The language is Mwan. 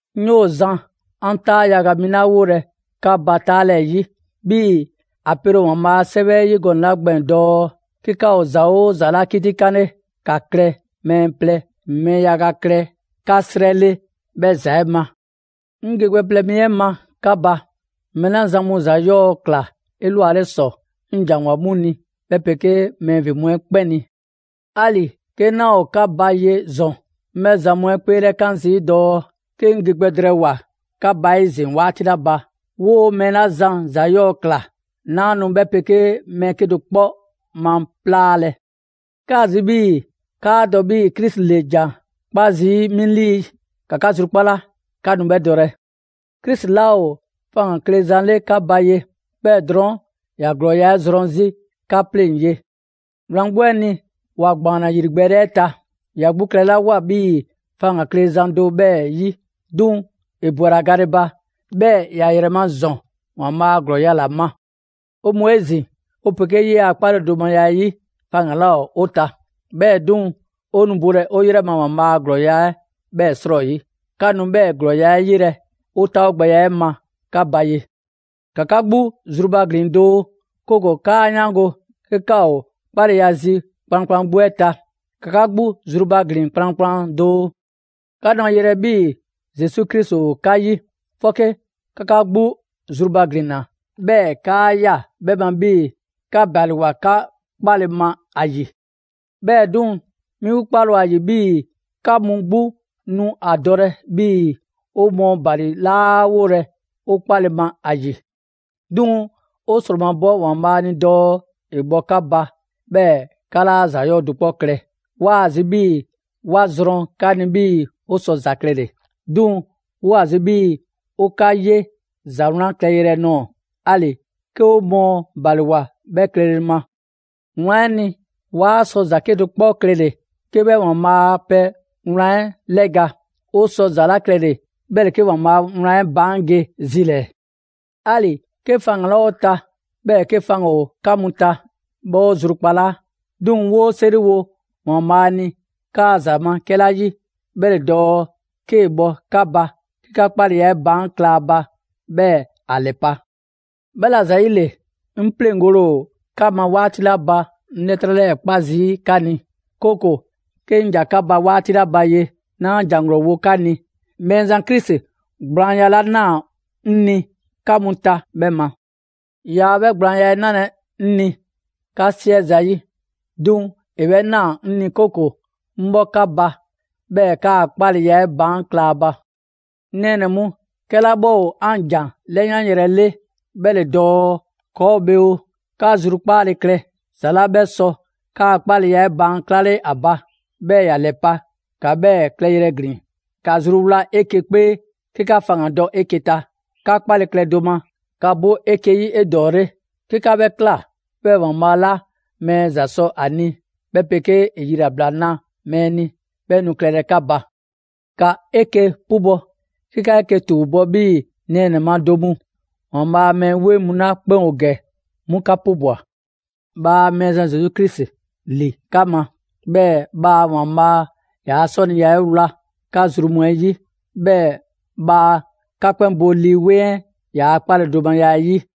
'Ŋ 'yoo‑ zan 'an 'taa yaga mi ‑la 'wolɛ‑ 'ka ba 'taalɛɛyi. 'Bhii‑ ‑a pele ‑o ‑Waanbhaa' a 'Sɛwɛ 'ɛ 'yi gɔnɛ‑ 'la gbɛɛn‑ dɔɔ: «'Ke 'ka ‑o ‑za 'oo ‑za 'la 'kitikanle, ‑ka mɛɛ plɛ, mɛɛ yaga klɛ 'ka 'srɛ 'le 'bhɛ ‑za 'ɛ ma.» 'Ŋ ge gbɛ plɛ mi 'ɛ ma 'ka ba, mɛɛ 'la zan mu ‑za 'yɔɔ‑ ꞊kla 'elwale ‑sɔ 'ŋ ‑janwoa 'mu ni 'bhɛ 'pegee mɛɛ ‑vin mu 'ɛ 'kpɛn ni. 'Ali‑ 'ke 'naa ‑o 'ka ba ye ‑zɔn, 'ŋ 'bhɛ zan mu 'ɛ 'kpeelɛkan zii' dɔɔ, 'ke 'ŋ ge gbɛ drɛɛwoa‑ 'ka ba 'ezin‑ 'waati 'la ba, 'woo‑ mɛɛ 'la zan ‑za 'yɔɔ‑ ꞊kla, 'naa nu 'mu 'pegee mɛɛ 'kedo‑ 'kpɔ maplaalɛ. 'Kaa‑ zi 'bhii‑ 'kaa dɔ 'bhii‑ Krisi ‑le ‑jan 'kpa zii' 'mi 'lii; ‑ka 'ka zrukpala, 'ka nu 'bhɛ dɔlɛ. Krisi 'laa ‑o faŋgan‑ kle zan 'le 'ka ba ye; 'bhɛɛ‑ drɔɔn' ‑ya ‑glɔɔya' 'ɛ zrɔn 'zi 'ka 'pleŋ‑ ye. Wlan 'gbu 'ɛ ni, ‑wa ‑gbaanna ‑yrigbɛɛle 'ɛ ta, ‑ya 'gbu klɛlawoa 'bhii‑ faŋgan‑ kle zan do 'bhɛɛ‑ 'yi. 'Duŋ‑ ‑e ‑bwela gale ba, 'bhɛɛ‑ ‑ya ‑yrɛ ma ‑zɔn ‑Waanbhaa' a ‑glɔɔya' ‑la ma. 'O mu 'ezin‑, 'o 'pegee 'yee‑ a 'kpaledomaya 'ɛ 'yi, faŋgan‑ 'laa ‑o 'o ta. 'Bhɛɛ‑ 'duŋ‑, 'o nu bolɛ 'o 'yrɛ ma ‑Waanbhaa' a ‑glɔɔya' 'bhɛɛ‑ 'srɔyi. 'Ka nu 'bhɛɛ‑ ‑glɔɔya' 'ɛ 'yelɛ‑ 'o taawogbɛya 'ɛ ma 'ka ba ye. ‑Ka 'ka 'gbu zrubaglin doo, 'kooko‑ 'kaa 'yaango‑ 'ke 'ka ‑o 'kpaleya zi kplankplan 'gbu 'ɛ ta. ‑Ka 'ka 'gbu zrubaglin kplankplan doo. 'Ka nu a 'yelɛ‑ 'bhii‑ Zesu Krisi ‑o 'ka 'yi. 'Fɔke 'ka 'ka 'gbu zrubaglinna, 'bhɛɛ‑ 'kaa ꞊ya 'bhɛ ma 'bhii‑ 'ka ‑baliwoa 'ka 'kpale‑ ma ‑a ‑yi. 'Bhɛɛ‑ 'duŋ‑, 'mi 'kpale‑ ‑o ‑a ‑yi 'bhii‑ 'ka mu 'gbu nu ‑a dɔlɛ 'bhii‑ 'o mɔɔ ‑bali 'laa 'wolɛ‑ 'o 'kpale‑ ma ‑a ‑yi. 'Duŋ‑ 'o ‑sromabɔ ‑Waanbhaa' ni dɔɔ ‑e bhɔ 'ka ba 'bhɛɛ‑ 'ka 'laa ‑za 'yɔɔ‑ do 'kpɔ klɛ. 'Waa‑ zi 'bhii‑ 'wa zrɔn 'ka ni 'bhii‑ 'o sɔ ‑za klɛle‑. 'Duŋ‑ 'woo‑ ‑a zi 'bhii‑ 'o 'ka 'ye ‑za 'wlan klɛ yrɛ nɔɔ‑; 'ali‑ 'ke 'o mɔɔ ‑baliwoa 'bhɛ klɛle ma. Wlan 'ɛ ni, 'waa sɔ ‑za 'kedo‑ 'kpɔ klɛle‑ 'ke 'bhɛ ‑Waanbhaa' a pɛ wlan 'ɛ 'lɛga‑. 'O sɔ ‑za 'la klɛle‑ 'bhɛ ‑le 'ke ‑Waanbhaa' a wlan 'ɛ baan' ge zi ‑lɛɛ. 'Ali‑ 'ke faŋgan‑ 'laa ‑o 'o ta, 'bhɛɛ‑ 'ke faŋgan‑ ‑o 'ka mu ta, 'bhɛ 'o zrukpalaa. 'Duŋ‑ 'woo 'seriwo ‑Waanbhaa' ni 'kaa‑ ‑za ma 'kɛla 'yi, 'bhɛ ‑le dɔɔ 'kee‑ bhɔ 'ka ba 'ke 'ka 'kpaleya 'ɛ baan' kla ‑a ba, 'bhɛɛ‑ ‑a ‑lɛpa'. 'Bhɛla‑ ‑zayile, 'ŋ 'pleŋgole ‑o 'ka ma 'waati 'la ba 'ŋ 'lɛtrɛ 'lɛɛ‑ 'kpa zii' 'ka ni, 'kooko‑ 'ke 'ŋ ‑ja 'ka ba 'waati 'la ba ye, 'naa ‑jan ‑glɔɔ wo 'ka ni, Mɛɛzan Krisi gblaanya 'la ꞊naa 'ŋ ni 'ka mu ta 'bhɛ ma. Yaa 'bhɛ gblaanya 'ɛ 'nalɛ‑ 'ŋ ni 'ka 'siɛ zayi', 'duŋ‑ ‑e 'bhɛ ꞊naa 'ŋ ni 'kooko‑ 'ŋ 'bhɔ 'ka ba 'bhɛɛ‑ 'kaa‑ 'kpaleya 'ɛ baan' kla ‑a ba. 'Ŋ nɛɛnɛ‑ mu, 'kɛla 'bhɛ ‑o 'an ‑jan 'lɛyanyrɛ 'le, 'bhɛ ‑le dɔɔ ‑kɔɔ' ‑o bhe oo, 'ka zrukpaale klɛ! ‑Za 'la 'bhɛ sɔ 'kaa‑ 'kpaleya 'ɛ baan' 'klale ‑a ba, 'bhɛɛ‑ ‑ya ‑lɛpa', ‑ka 'bhɛɛ‑ klɛyrɛ ‑glin. ‑Ka zruwla 'eke‑ 'kpee 'ke 'ka faŋgandɔ 'eke‑ ta; 'ka 'kpale‑ klɛ do ma; ‑ka bo 'eke‑ 'yi 'edɔɔle. 'Ke 'ka 'bhɛ ꞊kla, 'bhɛɛ‑ ‑Waanbhaa' 'la mɛɛ ‑za sɔ ‑a ni, 'bhɛ 'pegee ‑e yilabla na mɛɛ ni, 'bhɛ nu klɛlɛ 'ka ba. ‑Ka 'eke‑ 'pubɔ‑ 'ke 'ka 'eke‑ ‑tuubɔ' 'bhii‑ nɛɛnɛ‑ ma do mu. ‑Waanbhaa' a mɛɛ 'weŋ mu 'la 'kpɛn ‑o ‑gɛ, 'mu 'ka 'pubwa‑. Bhaa Mɛɛzan Zesu Krisi ‑li 'ka ma, 'bhɛɛ‑ bhaa ‑Waanbhaa' ‑yaa' 'sɔniya 'ɛ 'wla 'ka zru mu 'ɛ 'yi. 'Bhɛɛ‑ bhaa 'ka 'kpɛn bo Lii 'Weŋ 'ɛ ‑yaa' 'kpaledomaya 'ɛ 'yi!